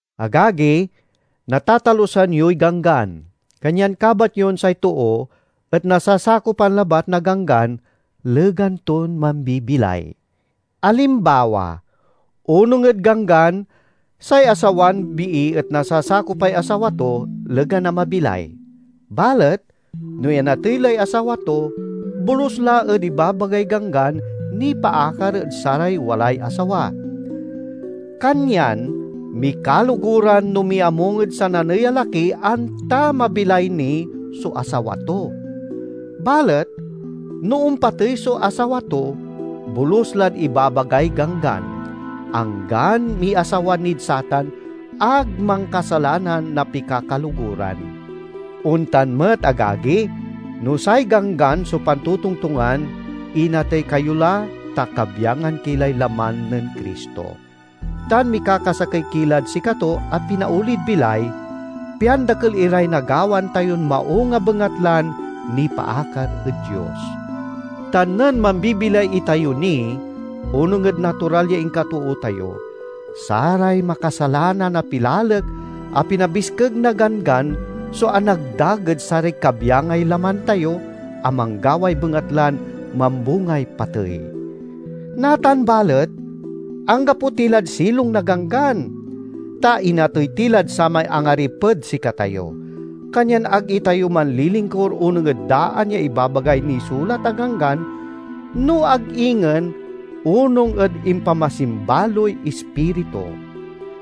Agagi, natatalusan yoy ganggan, kanyan kabat yon say too et nasasakopan labat na ganggan legan ton mambibilay. Alimbawa: onung ed ganggan, say asawan bii et nasasakopay asawa to legan a mabilay. Balet no inatey lay asawa to, bolus la ed ibabagay ganggan nipaakar ed saray walay asawa. Kanyan mikaloguran no miamung ed sananey a laki, anta mabilay ni so asawa to. Balet no ompatey so asawa to, bolus lad ibabagay ganggan. Anggan miasawa nid satan, ag mankasalanan na pikakaloguran. Ontan met, agagi, no say Ganggan so pantotongtongan inatey kayo la, ta kabyangan ki lay laman nen Cristo; tan mikakasakey ki lad sikato a pinaolid bilay, pian dakel iray nagawaan tayon maung a bengatlan nipaakar ed Dios. Ta nen mambibilay itayo ni onung ed natural ya inkatoo tayo, saray makasalanan a pilalek a pinabiskeg na Ganggan so anagdag ed saray kabyangay laman tayo a manggaway bengatlan mambungay patey. Natan balet, anggapo ti lad silong na Ganggan, ta inatey ti lad samay angariped sikatayo. Kanyan ag itayo manlilingkur onung ed daan ya ibabagay nisulat a ganggan, no ag ingen onung ed impamasimbaloy Ispiritu.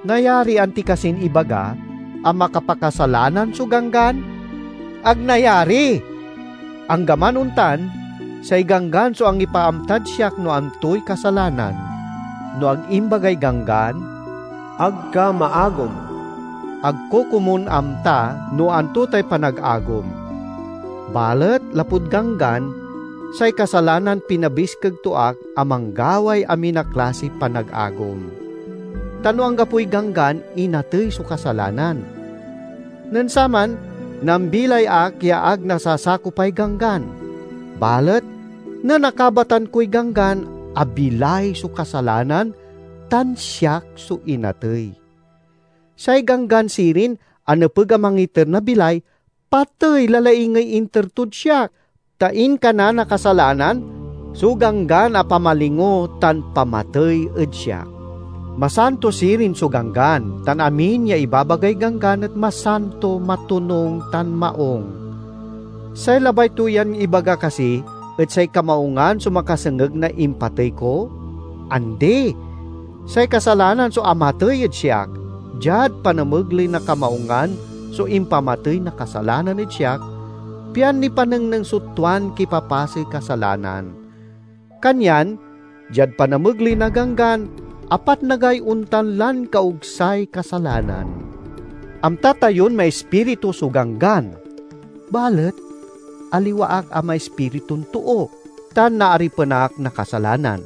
Nayarian ti kasin ibaga a makapakasalanan so Ganggan? Ag nayari! Anggaman ontan, say Ganggan so angipaamtad siak no antoy kasalanan. No ag imbagay Ganggan, "Ag ka maagom," ag ko komun amta no anto tay panagagom. Balet lapud Ganggan, say kasalanan pinabiskeg to ak a manggaway amin a klasiy panagagom. Ta no anggapoy ganggan, inatey so kasalanan. Nen saman nambilay ak ya ag nasasakopay ganggan; balet nen akabatan koy ganggan, abilay so kasalanan tan siak so inatey. Say ganggan sirin a nepeg a mangiter na bilay, patey la laingey inter tod siak. Ta inkana na kasalanan so ganggan a pamalingo tan pamatey ed siak. Masanto sirin so Ganggan, tan amin ya ibabagay ganggan et masanto, matonung, tan maung. Say labay to yan ibaga kasi et say kamaungan so makasengeg na impatey ko? Andi! Say kasalanan so amatey ed siak; diad panamegley na kamaungan so impamatey na kasalanan ed siak, pian nipanengneng so tuan kipapasey kasalanan. Kanyan diad panamegley na ganggan, apatnagay ontan lan kaogsay kasalanan. Amta tayon maispiritu so Ganggan, balet aliwa ak a maispiritun too, tan naaripen ak na kasalanan.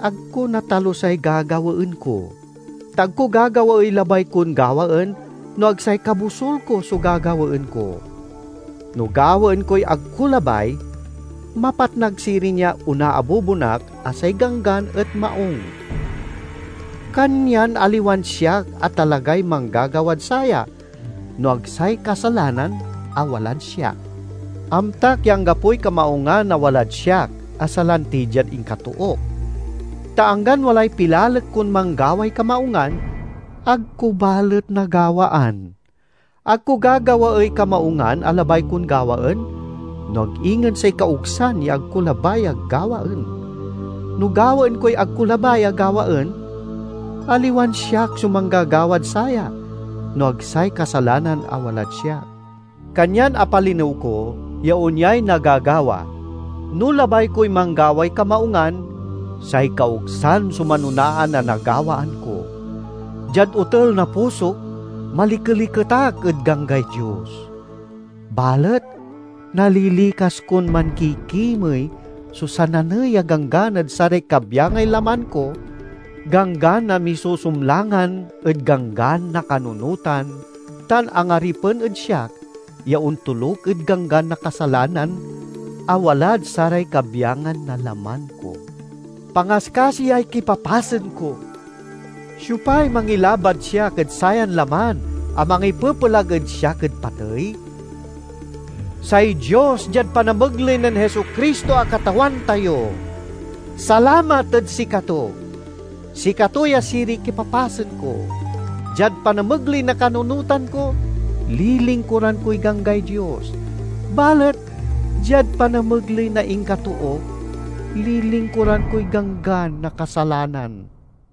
Ag ko natalusay gagawaen ko; ta ag ko gagawaey labay kon gawaen, no ag say kabosul ko so gagawaen ko. No gawaen koy ag ko labay, mapatnag sirin ya onaabubon ak a say Ganggan et maung. Kanyan aliwan siak a talagay manggagawad saya, no ag say kasalanan a walad siak. Amtak ya anggapoy kamaungan a walad siak, a salanti diad inkatook. Ta anggan walay pilalek kon manggaway kamaungan, ag ko balet nagawaan. Ag ko gagawaey kamaungan a labay kon gawaen, no ag ingen say kaogsan ya ag ko labay a gawaen. No gawaen koy ag ko labay a gawaen, aliwan siak so manggagawad saya no ag say kasalanan a walad siak. Kanyan apalinew ko ya onyay nagagawa: no labay koy manggaway kamaungan, say kaogsan so manonaan a nagawaan ko. Diad otel na pusok, malikeliket ak ed ganggay Dios. Balet nalilikas kon mankikimey so sananey a ganggan ed saray kabyangay laman ko, ganggan a misusumlangan ed ganggan na kanunotan tan angaripen ed siak ya ontoluk ed ganggan na kasalanan a walad saray kabyangan na laman ko. Pangaskasiyay kipapasen ko! Siopay mangilabad siak ed sayan laman a mangipepelag ed siak ed patey? Say Dios diad panamegley nen Jesu-Cristo a Katawan tayo! Salamat ed sikato. Sikato ya siriy kipapasen ko: diad panamegley na kanunotan ko, lilingkuran koy ganggay Dios; balet diad panamegley na inkatook, lilingkuran koy ganggan na kasalanan.